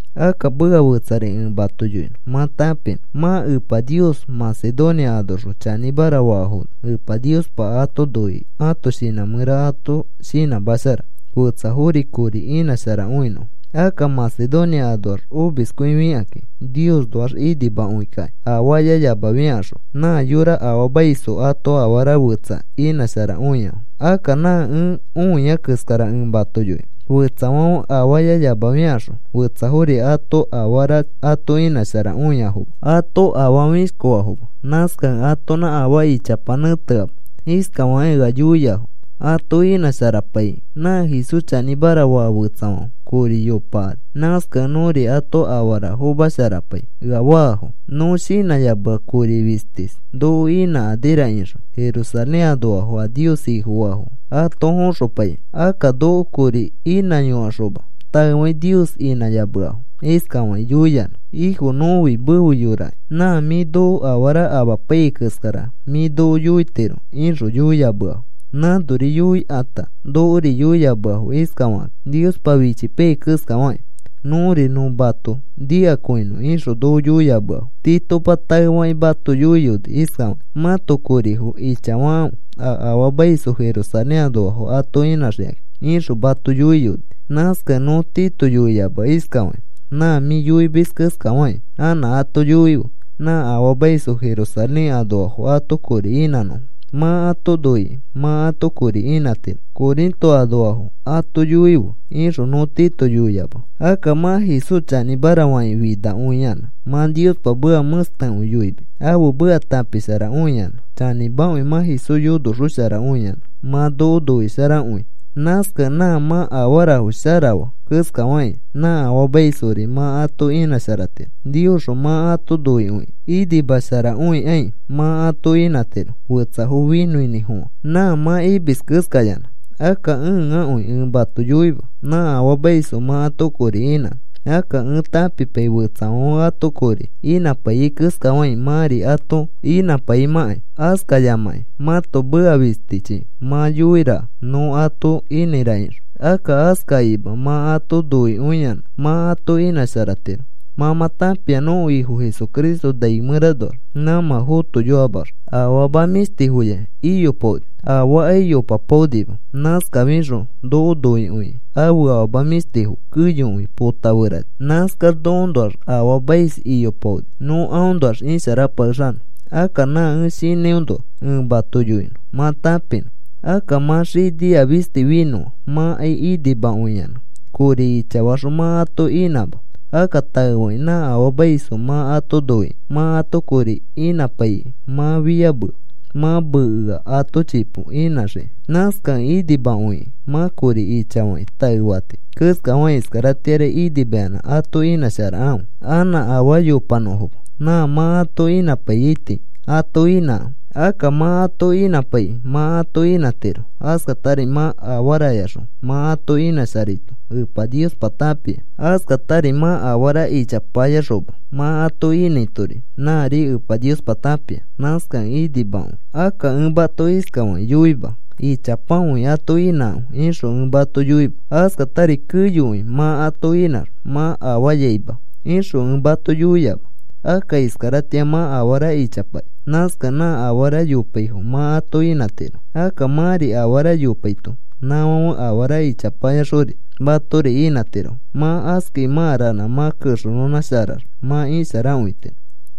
Akka meka fetsari ẽ mato yoinõ mã tãpinõ. Mã Epa Nios Macedonia anoxõ chanĩmara faafono Epa Niospa ato noikĩ ãto shinã mẽraxõ ato shinãmashara fetsafori kori inãsharakõinõfo. Akka Macedonia anoax omiskõifikakĩ Niosnoax inimakõikakĩ, afaayayamafiakaxõ nã yora afaamaisfo ato afara fetsa inãsharakõiafo. Akka nã ẽ õia keskara ẽ mato yoinõ. Fetsafãfe afaayayamafiakaxõ fetsafori ato afara ato inãsharakõiafo. Ato afaa fĩshkofafoma. Nãskakẽ atonã afaa ichapa nẽteama. Iskafakĩ ea yoiafo ato inãsharapaikĩ: “Nã Jesús chanĩmara faa fetsafãfe kori yopakani. Nãskakẽ nõri ato afara fomasharapai,” ea faafo. Nõ shinãyamea kori fistis noko inãkanira ixõ, Jerusalén anoafo a Nios Ifofaafo ato foxopaikĩ. Akka noko kori inãyokaxoma taefakĩ Nios inãyameafo, iskafakĩ yoiyanã: “Ifo, nõfi mefe yorakĩ nã mĩ noko afara amapaiyai keskara mĩ noko yoitiro,” ixõ yoiyameafo. Nãnori yoikãta nokori yoiyameafo iskafakakĩ Niospa fichipaiyai keskafakĩ: “Nõri nõ mato nikakõinõ,” ixõ noko yoiyameafo. Titopa taefakĩ mato yoiyoni iskafakĩ: “Mãto korifo ichafakãfe a afaamaisfo Jerusalén anoafo ato inãxikakĩ,” ixõ mato yoiyoni. Nãskakẽ nõ Tito yoiyamea iskafakĩ: “Nã mĩ yoimis keskafakĩ anã ato yoife nã afaamaisfo Jerusalén anoafo ato kori inãnõfo. ‘Mã ato noikĩ mã ato kori inãtiro,’ Corinto anoafo ato yoife,” ixõ nõ Tito yoiyamea. Akka mã Jesús chanĩmara fakĩ finakõiyanã mã Niospa meka mẽstekõi yoimis, ãfe meka tãpisharakõiyanã. Chanĩmakõi mã Jesús yonoxosharakõiyanã mã noko noisharakõi. Nãskakẽ nã mã afarafo shara faa keskafakĩ nã afaamaisfori mã ato inãsharatiro. Niosxõ mã ato noikõikĩ inimasharakõikai mã ato inãtiro, fetsafo finõkõinĩfofã nã mã imis keskayanã. Akka ẽakõi ẽ mato yoima nã afaamaisfo mã ato kori inãnõ. Akka ẽ tãpipai fetsafãfe ato kori inãpaiyai keskafakĩ mãri ato inãpaimãkai. Askayamakĩ mãto meka fistichi mã yoiaraka nõ ato inãira ixõ. Akka askakĩma mã ato noikõiyanã mã ato inãsharatiro. Mã mã tãpia nõko Ifo Jesucristo nai mẽranoax nãmã fotoyoamax afama mĩshtifoya iyopaoni. Afaakai yopapaonima. Nãskafixõ noko noikõikĩ ãfe afama mĩshtifo keyokõi potãferani. Nãskax nokoõnoax afaamais iyopaoni nõ aõnoax isharapakexanõ. Akka nã ẽ shinãinoa ẽ mato yoinõ mã tãpinõ. Akka mã xinia fisti finõa mãkai inimakõiyanã kori ichafaxõ mã ato inãma. Akka taefakĩ nã afaamaisfo mã ato noikĩ mã ato kori inãpaikĩ mã fiyamea mã mekea ato chipo inãxiki. Nãskakẽ inimakõikĩ mã kori ichafakĩ taefati keskafakĩ iskaratĩari inimayanã ato inãsharakãfe anã afaa yopanõfoma. Nã mã ato inãpaiyaiti ato inãkãfe. Akka mã ato inãpaikĩ mã ato inãtiro. Askatari mã afarayaxõ mã ato inãsharaito Epa Niospa tãpia. Askatari mã afara ichapayaxoõma mã ato inãitori nãri Epa Niospa tãpia. Nãskakẽ inimakõi. Akka ẽ mato iskafakĩ yoima: “Ichapakõi ato inãkãfe,” ixõ ẽ mato yoima. “Askatari keyokõi mã ato inãx mã afayaima,” ixõ ẽ mato yoiama. Akka iskaratĩa mã afara ichapaya. Nãskakẽ nã afara yopaifo mã ato inãtiro. Akka mãri afara yopaito nãfãfe afara ichapayakaxori matori inãtirofo. Mã askai mã ranã mã kexenõnãsharax mã isharakõitiro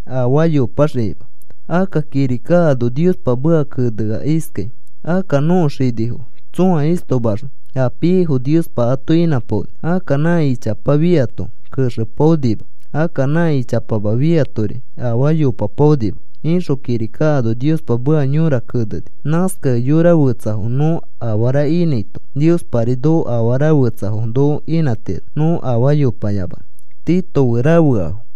afaa yopaxikima. Akka kirika ano Niospa meka kenea iskai: “Akka nõko xinifo tsõa istomaxõ a piaifo Niospa ato inãpaoni. Akka nã ichapa fiato texefapaonima. Akka nã ichapama fiatori afaa yopapaonima,” ixõ kirika ano Niospa meka yõra keneni. Nãskakẽ yora fetsafo nõ afara inãito, Niospari noko afara fetsafo noko inãtiro nõ afaa yopayamanõ.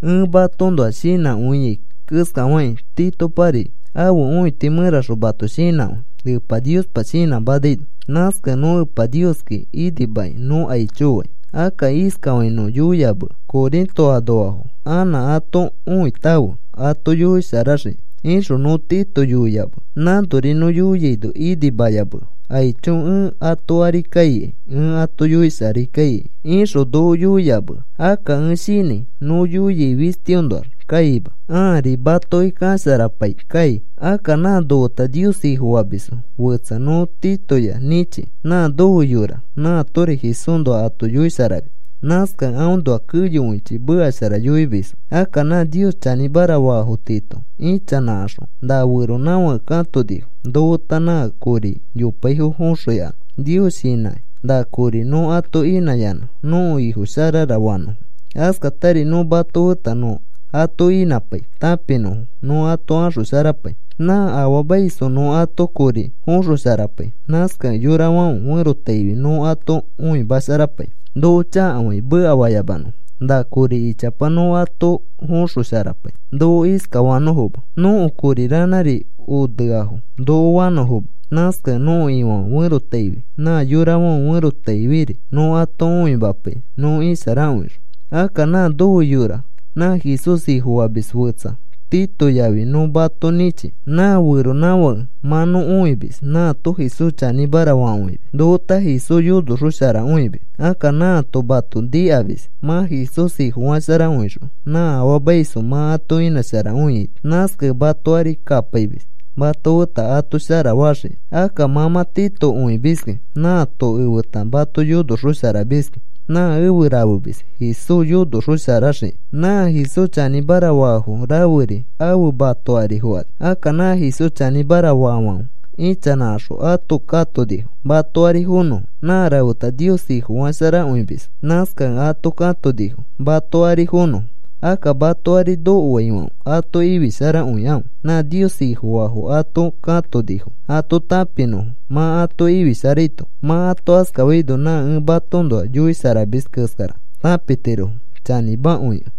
Ẽ matoõnoa shinãkõiai keskafakĩ Titopari ãfe õiti mẽraxõ mato shinãkõi, Epa Niospa shinãmanaino. Nãskakẽ nõ Epa Nioski inimakĩ nõ aicho fai. Akka iskafakĩ nõ yoiyamea: “Corinto anoafo anã ato õitãfe ato yoisharaxikĩ,” ixõ nõ Tito yoiyamea. Nãnori nõ yoiaino inimayamea. “Aicho, ẽ ato ari kaikai ẽ ato yoisharai kaikai,” ixõ noko yoiyamea. Akka ẽ shinãi nõ yoiai fistiõnoax kaima. Ãari matoki kasharapai kai. Akka nã nofeta Nios Ifofamis fetsa nõ Titoya nĩchi. Nã nofe yora, nãatori Jesúsnoa ato yoisharamis. Nãskakẽ aõnoa keyokõichi meka shara yoimisfo. Akka nã Nios chanĩmara faafo tiito ichanãkaxõ na feronãfake katonifo, nofeta nã kori yopaifo foxõikanõ. Nios shinãkĩ na kori nõ ato inãyanã nõko Ifo sharara fanõfo. Askatari nõ mato feta nõ ato inãpai tãpinõfo nõ ato axosharapai. Nã afaamaisfo nõ ato kori foxosharapai. Nãskakẽ yorafãfe ferotaifi nõ ato õimasharapai noko chakafakĩ mekafayamanõfo. Na kori ichapa nõ ato foxosharapai noko iskafanõfoma: “Nõko kori ranãri oneafo,” noko fanõfoma. Nãskakẽ nõko Ifãfe ferotaifi nã yorafãfe ferotaifiri nõ ato õimapai nõ isharakõixõ. Akka nã nofe yora nã Jesús Ifofamis fetsa Tito yafi nõ mato nĩchi. Nã feronãfake mã nõ õimis nãato Jesús chanĩmara fakõimis. Nofeta Jesús yonoxosharakõimis. Akka nãato mato nikamis mã Jesús Ifofasharakõixõ nã afaamaisfo mã ato inãsharakõiaito. Nãskakẽ mato ari kapaimis mato feta ato shara faxiki. Akka mã mã Tito õimiski. Nãato efeta mato yonoxosharamiski. Nã efe rafemis Jesús yonosharaxoxiki. Nã Jesús chanĩmara faafo raferi afe mato ari fokani. Akka nã Jesús chanĩmara faafãfe ichanãkaxõ ato katonifo mato ari fonõfo. Nã rafeta Nios Ifofasharakõimisfo. Nãskakẽ ato katonifo mato ari fonõfo. Akka mato ari nokofaifãfe ato ifisharakõikãfe nã Nios Ifofaafo ato katonifo ato tãpinõfo mã ato ifisharaito. Mã ato askafaino nã ẽ matoõnoa yoisharamis keskara tãpitirofo chanĩmakõikẽ.